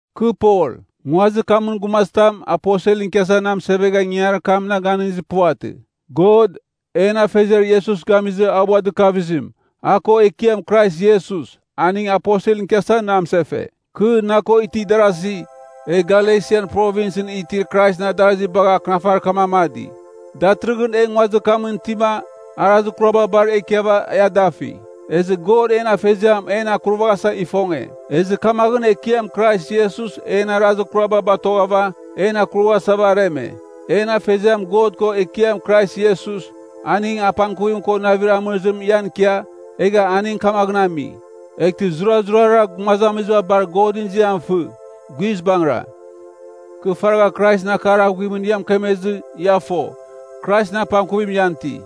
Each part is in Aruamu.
Kɨ Pol. Nguazir kamɨn gumazitam aposelɨn ikiasa na mɨsevegha ingangarir kam na ganɨngizir puvatɨ. God, en Afeziar Iesus gamizɨ a ua dɨkavizim, a ko Ekiam Krais Iesus, aning aposelɨn ikiasa na mɨsefe. Kɨ, na ko itir darazi, e Galesian Provinsɨn itir Kraisɨn adarazi bagha akɨnafarir kam amadi. Datɨrɨghɨn e nguazir kamɨn itima, arazir kuraba bar e ikiava e adafi. Ezɨ God en Afeziam en akurvaghasa ifonge. Ezɨ kamaghɨn Ekiam Krais Iesus en arazir kuraba batoghɨva, en akurvaghasava areme. En Afeziam God ko Ekiam Krais Iesus, aning apangkuvim ko navir amɨrizim ian ikia, egha aning kamaghɨn ami. Eghtɨ zurazurara gumazamiziba bar Godɨn ziam fɨ. Guizbangɨra. Kɨ faragha Kraisɨn akar aghuimɨn ia mɨkemezɨ, ia fo, Kraisɨn apangkuvim ian iti.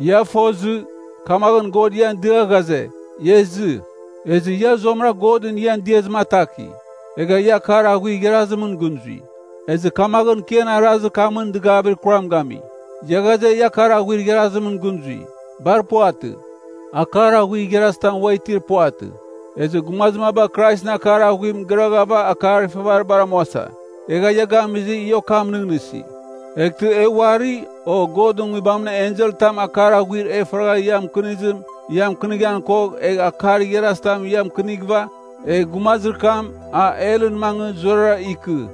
Ia fozɨ, kamaghɨn God ian dia ghaze, ia izɨ. Ezɨ ia zuamɨra Godɨn ian diazim ataki. Egha ia akar aghuir igharazimɨn gɨn zui. Ezɨ kamaghɨn kɨ ian arazir kamɨn dɨgavir kuram gami. Ia ghaze, ia akar aghuir igharazimɨn gɨn zui. Bar puvatɨ, akar aghuir igharazitam ua itir puvatɨ. Ezɨ gumazir maba Kraisɨn akar aghuim gɨraghava akar ifavaribar amuasa. Egha ia gamizɨ, ia okam nɨghnɨsi. Eghtɨ e uari, o Godɨn nguibamɨn enselɨn tam akar aghuir e faragha ia mɨkɨnizim ia mɨkɨnighan kogh, egh akar igharazitam ia mɨkɨnighɨva, egh gumazir kam, a helɨn mangɨ zurara ikɨ!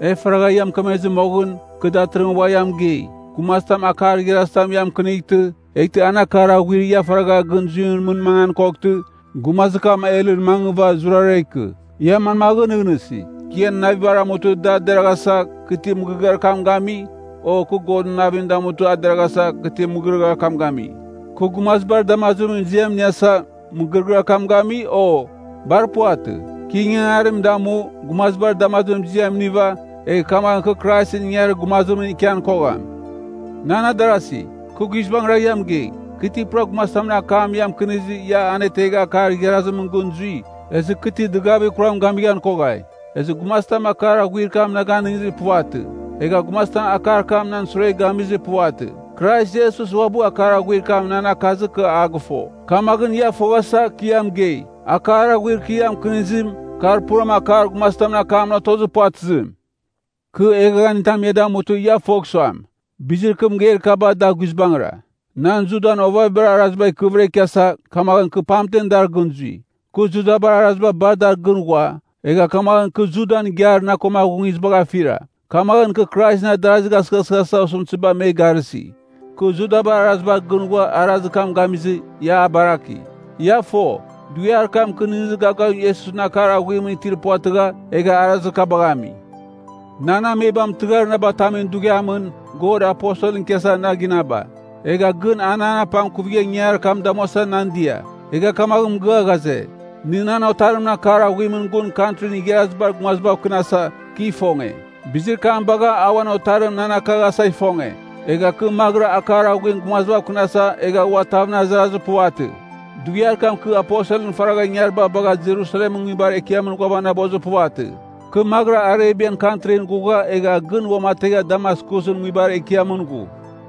E faragha ia mɨkemezɨ moghɨn, kɨ datɨrɨghɨn ua ia mɨgei. Gumazitam akar igharazitam ia mɨkɨnightɨ, eghtɨ an akar aghuir ia faragha gɨn zuimɨn mɨn mangan koghtɨ, gumazir kam helɨn mangɨva zurara ikɨ! Ia manmaghɨn nɨghnɨsi? Kɨ ian navibar amutɨ da deraghasa, kɨ ti mɨgɨrɨgɨar kam gami? O kɨ Godɨn navim damutɨ a deraghasa, kɨ ti mɨgɨrɨgɨar kam gami? Kɨ gumazibar damazimɨn ziam iniasa, mɨgɨrɨgɨar kam gami, o? Bar puvatɨ. Kɨ ingangarir kam damu, gumazibar damazimɨn ziam iniva, egh kamaghɨn kɨ Kraisɨn ingangarir gumazimɨn ikian kogham. Nan adarasi, kɨ guizbangɨra ia mɨgei. Kɨ ti pura gumazitamɨn akam ia mɨkɨnizɨ ia anetegha akar igharazimɨn gɨn zui, ezɨ kɨ ti dɨgavir kuram gamighan koghai. Ezɨ gumazitam akar aghuir kam na ganɨngizir puvatɨ. Egha gumazitam akar kam nan sure gamizir puvatɨ. Krais Iesus uabɨ akar aghuir kam nan akazɨ kɨ a gɨfo. Kamaghɨn ia foghasa, kɨ ia mɨgei, akar aghuir kɨ ia mɨkɨnizim, kar puram akar gumazitamɨn akamɨn otozir puvatɨzim. Kɨ eghaghanitam ia damutɨ ia fogh suam, bizir kɨ mɨgeir kaba da guizbangɨra. Nan Judan ovavibar araziba ikɨvɨra ikiasa, kamaghɨn kɨ pamtem dar gɨn zui. Kɨ Judabar araziba bar dar gɨn ghua, egha kamaghɨn kɨ Judan igiar na ko aghungizibagh afira. Kamaghɨn kɨ Kraisɨn adarazigh asɨghasɨghasa osɨmtɨziba me garɨsi. Kɨ Judabar arazibar gɨn ghua arazir kam gamizɨ, ia a baraki. (Ia fo, dughiar kam kɨ nɨghnɨzir gavgavim Iesusɨn akar aghuimɨn itir puvatɨgha, egha arazir kabagh ami.) Nan amebam tɨghar na batamin dughiamɨn God aposelɨn ikiasa na ginaba. Egha gɨn a nan apangkuvigha ingangarir kam damuasa nan dia. Egha kamaghɨn mɨgɨa ghaze, nɨ nan otarimɨn akar aghuimɨn gun Kantrin Igharazibar Gumazibav kɨnasa, kɨ ifonge. Bizir kam bagha a uan otarim nan akaghasa ifonge. Egha kɨ maghɨra akar aghuim gumazibav kɨnasa egha ua tavɨn azarazir puvatɨ. Dughiar kam kɨ aposelɨn faragha ingariba bagha Jerusalemɨn nguibar ekiamɨn ghuavanabozir puvatɨ. Kɨ maghɨra Arebian kantrin ghugha egha gɨn uamategha Damaskusɨn nguibar ekiamɨn ghu.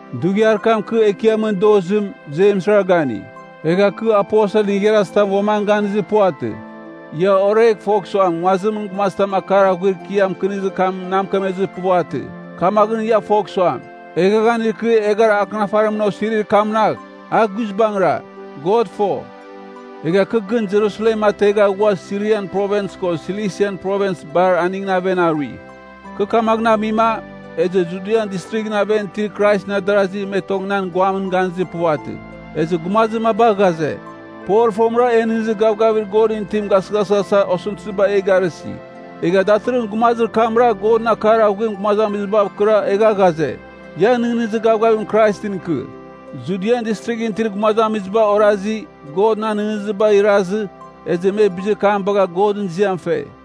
Dughiar kam kɨ Ekiamɨn dozim, Jemsra gani. Egha kɨ aposelɨn igharazitam uam an ganizir puvatɨ. Ia oregh fogh suam nguazimɨn gumazitam akar aghuir kɨ ia mɨkɨnizir kamɨn na mɨkemezir puvatɨ. Kamaghɨn ia fogh suam, eghaghanir kɨ eghara akɨnafarimɨn osirir kamnagh, a guizbangɨra. God fo. Egha kɨ gɨn Jerusalem ategha ghua Sirian Provins ko Silisan Provins bar aningɨn aven arui. Kɨ kamaghɨn amima, ezɨ Judian Distrighɨn aven itir Kraisɨn adarazi me tong nan guamɨn ganizir puvatɨ. Ezɨ gumazir maba ghaze, Pol fomɨra en nɨghnɨzir gavgavir Godɨn itim gasɨghasɨghasa osɨmtɨziba e garɨsi. Egha datɨrɨghɨn gumazir kamra Godɨn akar aghuim gumazamizibav kɨra egha ghaze, ia nɨghnɨzir gavgavim Kraisɨn ikɨ. Judian Distrighɨn itir gumazamiziba orazi, God nan nɨghnɨzibagh irazɨ, ezɨ me bizir kam bagha Godɨn ziam fe.